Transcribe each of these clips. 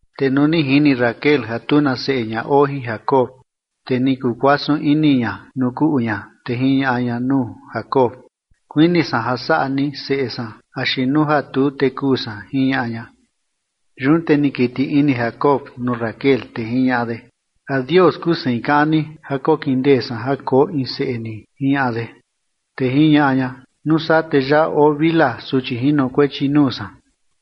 Te nuu ni jini Raquel ja tu na seꞌe ña oo jin Jacob, te ni kuu kuasun ini ña nuu kuꞌu ña, te jiñaꞌa ña nuu Jacob: ―Kuini san ja saꞌa ni seꞌe san axi nuu ja tuu, te kuu san ―jiñaꞌa ña. Yun te ni kiti ini Jacob nuu Raquel, te jiñaꞌa de: ―¿A Dios kuu sein kaꞌan ni ja kokindee san ja koo in seꞌe ni? ―jiñaꞌa de. Te jiñaꞌa ña: ―Nuu saa te yaꞌa oo Bilha, suchi jinokuechi nuu san,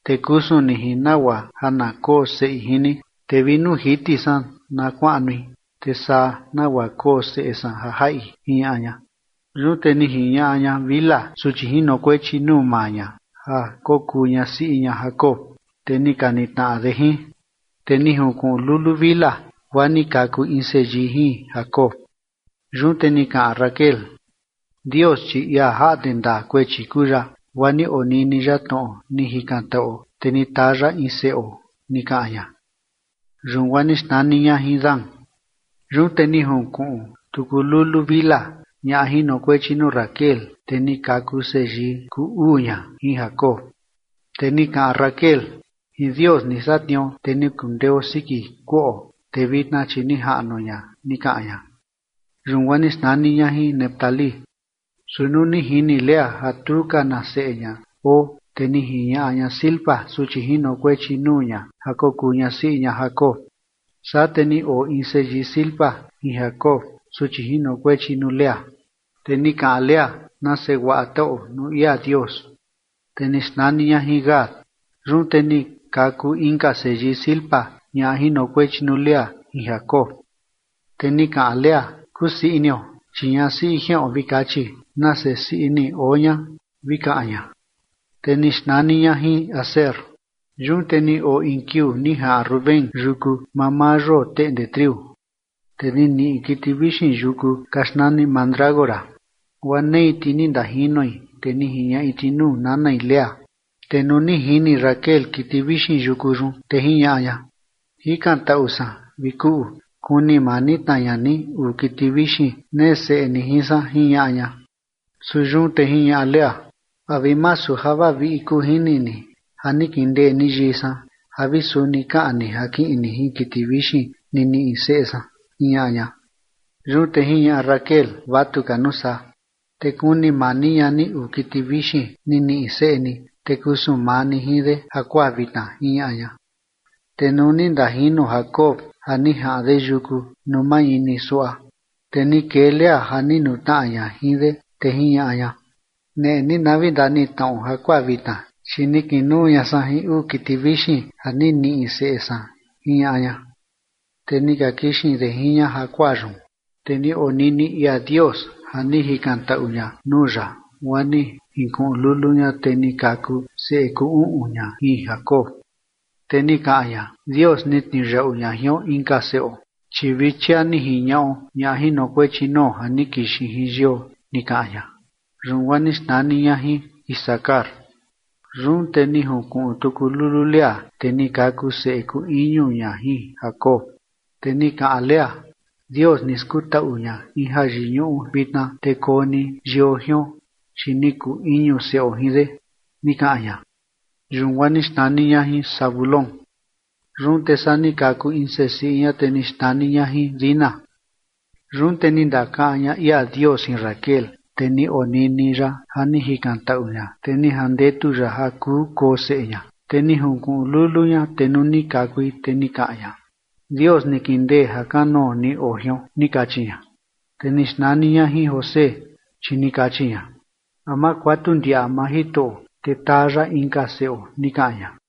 te kusun ni jin nagua ja na koo seꞌi jin ni, te vi nuu jiti san na kuaꞌnui, te saa nagua koo seꞌe san ja jaꞌi ―jiñaꞌa ña. Yun te ni jiñaꞌa ña Bilha suchi jinokuechi nuu maa ña ja kokuu ñasiꞌi ña Jacob, te ni ka nitnaꞌa de jin. Te ni junkuꞌun lulu Bilha guaa ni kaku in seyii jin Jacob. Yun te ni kaꞌan Raquel: ―Dios, chi ia jaꞌnde ndaa kuechi kuu ya, guaa ni onini ya tnoꞌo ni jikantaꞌuo, te ni taa ya in seꞌo ―ni kaꞌan ña. Yun guaa ni xnani ña jin Dan. Yun te ni junkuꞌun tuku lulu Bilha, ñaꞌa jinokuechi nuu Raquel, te ni kaku seyii kuu uu ña jin Jacob. Te ni kaꞌan Raquel: ―Jin Dios ni satniuo te ni kundeo siki kuꞌo, te vitna chi ni jaꞌnuo ña ―ni kaꞌan ña. Yun guaa ni xnani ña jin Neftalí. Su nuu ni jini Lea ja tu ka na seꞌe ña oo, te ni jiñaꞌa ña Zilpa, suchi jinokuechi nuu ña, ja kokuu ñasiꞌi ña Jacob. Saa te ni oo in seyii Zilpa jin Jacob, suchi jinokuechi nuu Lea. Te ni kaꞌan Lea: ―¡Nase guaa taꞌuo nuu ia Dios! Te ni xnani ña jin Gad. Yun te ni kaku inka seyii Zilpa, ñaꞌa jinokuechi nuu Lea, jin Jacob. Te ni kaꞌan Lea: ―¡Kusii inio! Chi ñasiꞌi jiꞌon vi kachi, “¡nase sii ini oo ña!”, vi kaꞌan ña. Te ni xnani ña jin Aser. Yun te ni oo in kiuu ni jaꞌan Rubén yuku mamaa yoo teꞌnde triu, te ni niꞌi kiti vixin yuku ka xnani mandrágora, guaa nei ti ni ndajinoi, te ni jiñaꞌi ti nuu nanai Lea. Te nuu ni jini Raquel kiti vixin yuku yun, te jiñaꞌa ña: ―Jikantaꞌu san, vi kuꞌu, kuni mani tna ña ni uu kiti vixin nee seꞌe ni jin san ―jiñaꞌa ña. Su yun te jiñaꞌa Lea: ―¿A vi masu ja vaviꞌi kuu jini ni ja ni kindee ni yii san ja vi suni kaꞌan ni ja kiꞌin ni jin kiti vixin ni niꞌi seꞌe san? ―jiñaꞌa ña. Yun te jiñaꞌa Raquel: ―Vatu ka nuu saa, te kuni mani ña ni uu kiti vixin ni niꞌi seꞌe ni, te kusun maa ni jin de jakuaa vitna ―jiñaꞌa ña. Te nuu ni ndajino Jacob ja ni jaꞌan de yuku nuu mañini suaꞌa, te ni kee Lea ja ni nutnaꞌa ña jin de, te jiñaꞌa ña: ―Neꞌe ni na vi ndanitnaꞌo jakuaa vitna, chi ni kinuu ña san jin uu kiti vixin ja ni niꞌi seꞌe san ―jiñaꞌa ña. Te ni ka kixin de jin ña jakuaa yun. Te ni onini ia Dios ja ni jikantaꞌu ña nuu ya, guaa ni jinkuꞌun lulu ña, te ni kaku seꞌe kuu uꞌun ña jin Jacob. Te ni kaꞌan ña: ―Dios ni tniuyaꞌu ña jion inka seꞌo, chi vi chia ni jiñaꞌo ñaꞌa jinokuechi nuo ja ni kixin jin yio ―ni kaꞌan ña. Yun guaa ni xnani ña jin Isacar. Yun te ni junkuꞌun tuku lulu Lea, te ni kaku seꞌe kuu iñu ña jin Jacob. Te ni kaꞌan Lea: ―Dios ni skutaꞌu ña in jayiñuꞌu vitna, te koo ni yio jion, chi ni kuu iñu seꞌo jin de ―ni kaꞌan ña. Yun guaa ni xnani ña jin Zabulón. Yun te saa ni kaku in sesiꞌi ña, te ni xnani ña jin Dina. Yun te ni ndakaꞌan ña ia Dios jin Raquel, te ni onini ya ja ni jikantaꞌu ña, te ni jandetu ya ja kuu koo seꞌe ña. Te ni junkuꞌun lulu ña, te nuu ni kakui, te ni kaꞌan ña: ―Dios ni kindee ja kanoo ni oo jion ―ni kachi ña. Te ni xnani ña jin José, chi ni kachi ña: ―A ma kuatu ndiaꞌa maa Jitoꞌo, te taa ya inka seꞌo ―ni kaꞌan ña.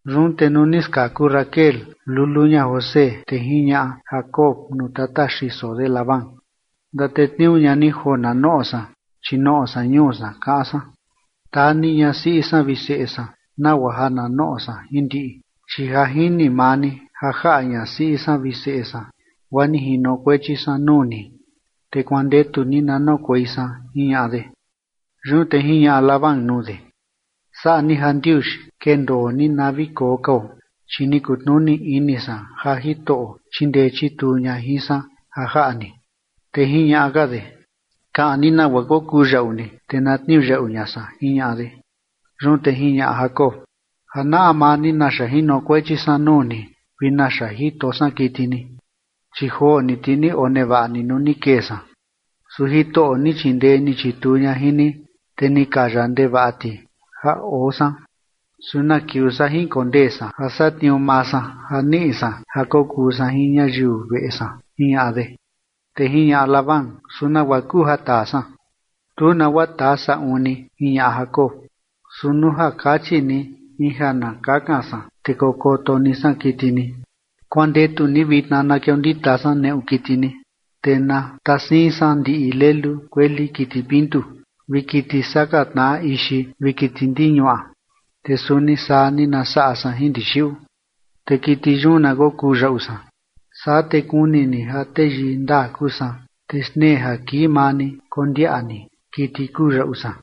Yun te nuu ni skaku Raquel lulu ña José, te jiñaꞌa Jacob nuu tata xiso de Labán: ―Ndatetniuu ña ni joo na noꞌo san, chi noꞌo san ñuu san, kaꞌan san. Taa ni ñasiꞌi san vi seꞌe san nagua ja na noꞌo san jin ndiꞌi, chi ja jini maa ni ja jaꞌa ñasiꞌi san vi seꞌe san guaa ni jinokuechi san nuu ni, te kuandetu ni na noꞌokuei san ―jiñaꞌa de. Yun te jiñaꞌa Labán nuu de: ―Saꞌa ni jandiuxi, kendoo ni na vi koo kao, chi ni kutnuni ini san ja Jitoꞌo chindee chituu ña jin san ja jaꞌa ni. Te jiñaꞌa ka de: ―Kaꞌan ni nagua kokuu yaꞌu ni, te na tniuyaꞌu ña san ―jiñaꞌa de. Yun te jiñaꞌa Jacob: ―Ja naꞌa maa ni naxa jinokuechi san nuu ni vi naxa jito san kiti ni. Chi joo ni ti ni onevaꞌa ni nuu ni kee san, su Jitoꞌo ni chindee ni chituu ña jin ni, te ni kaya ndevaꞌa ti ja oo san. ¿Su na kiuu saa jinkondee san ja satniuu maa san ja niꞌi san ja kokuu san jin ñayiu veꞌe san? ―jiñaꞌa de. Te jiñaꞌa Labán: ―¿Su nagua kuu ja taa san? ―Tu nagua taa saꞌun ni ―jiñaꞌa Jacob― Su nuu ja kachi ni in ja na kakan san, te kokoto ni san kiti ni. Kuandetu ni vitna na kiondita san neꞌu kiti ni, te na tasiin san ndiꞌi lelu kueli kiti pintu vi kiti saka tnaꞌa ixi vi kiti ndiñuaꞌa, te suni saa ni na saꞌa san jin ndixiꞌu. Te kiti yun na kokuu yaꞌu san. Saa te kuni ni ja teyii ndaa kuu san, te xtnee ja kii maa ni kondiaꞌa ni kiti kuu yaꞌu san.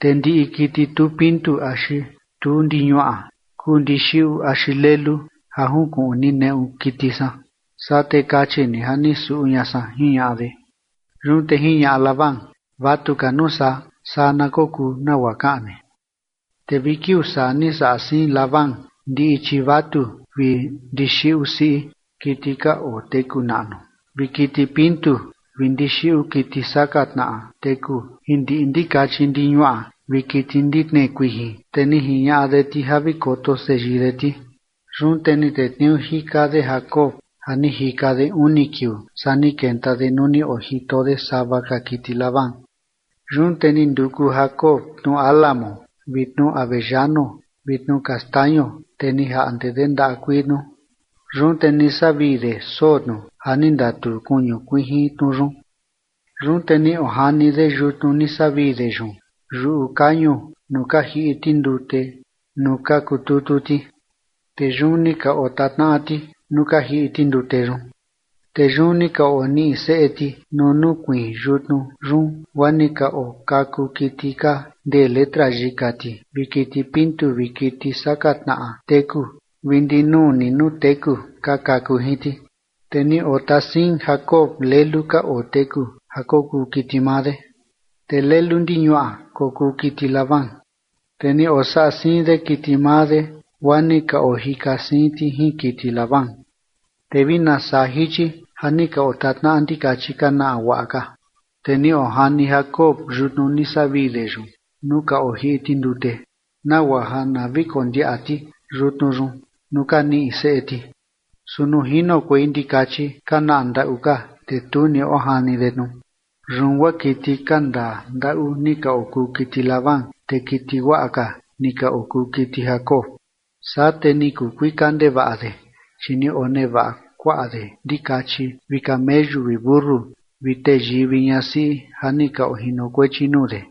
Te ndiꞌi kiti tu pintu axi tu ndiñuaꞌa kuu ndixiꞌu axi lelu ja junkuꞌun ni neꞌu kiti san, saa te kachi ni ja ni suꞌu ña san ―jiñaꞌa de. Yun te jiñaꞌa Labán: ―Vatu ka nuu saa, saa na kokuu nagua kaꞌan ni. Te vi kiuu saa ni saꞌa siin Labán ndiꞌi chivatu vi ndixiꞌu siꞌi kiti ka oteku naꞌnu vi kiti pintu vi ndixiꞌu kiti saka tnaꞌa teku jin ndiꞌi ndikachi ndiñuaꞌa vi kiti ndi tnee kuijin, te ni jiñaꞌa de ti ja vi koto seyii de ti. Yun te ni tetniuu jika de Jacob ja ni jika de uni kiuu, saa ni kenta de nuu ni ojito de sava ka kiti Labán. Yun te ni nduku Jacob tnu álamo vi tnu avellano vi tnu kastaño, te ni jaꞌnde de ndaꞌa kuii tnu, yun te ni savii de soo tnu ja ni ndatuu kuñu kuijin tnu yun. Yun te ni ojani de yutnu ni savii de yun yuꞌu kañu nuu ka jiꞌi ti ndute nuu ka kututu ti, te yun ni ka otatnaꞌa ti nuu ka jiꞌi ti ndute yun. Te yun ni ka oniꞌi seꞌe ti nuu nukuiin yutnu yun, guaa ni ka okaku kiti ka ndee letra yika ti vi kiti pintu vi kiti saka tnaꞌa teku vi ndinuu ni nuu teku ka kaku jin ti. Te ni otasiin Jacob lelu ka oteku ja kokuu kiti maa de, te lelu ndiñuaꞌa kokuu kiti Labán. Te ni osaꞌa siin de kiti maa de, guaa ni ka ojika siin ti jin kiti Labán. Te vi nasaa jichi ja ni ka otatnaꞌa ndikachi ka naꞌa guaꞌa ka, te ni ojani Jacob yutnu ni savii de yun nuu ka ojiꞌi ti ndute, nagua ja na vi kondiaꞌa ti yutnu yun nuu ka niꞌi seꞌe ti. Su nuu jinokuei ndikachi ka naꞌa ndaꞌu ka, te tu ni ojani de tnu. Yun guaa kiti ka ndaa ndaꞌu ni ka okuu kiti Labán, te kiti guaꞌa ka ni ka okuu kiti Jacob. Saa te ni kuu kuika ndevaꞌa de, chi ni onevaꞌa kuaꞌa de ndikachi vi kameyu vi mentu vi teyii vi ñasiꞌi ja ni ka ojinokuechi nuu de.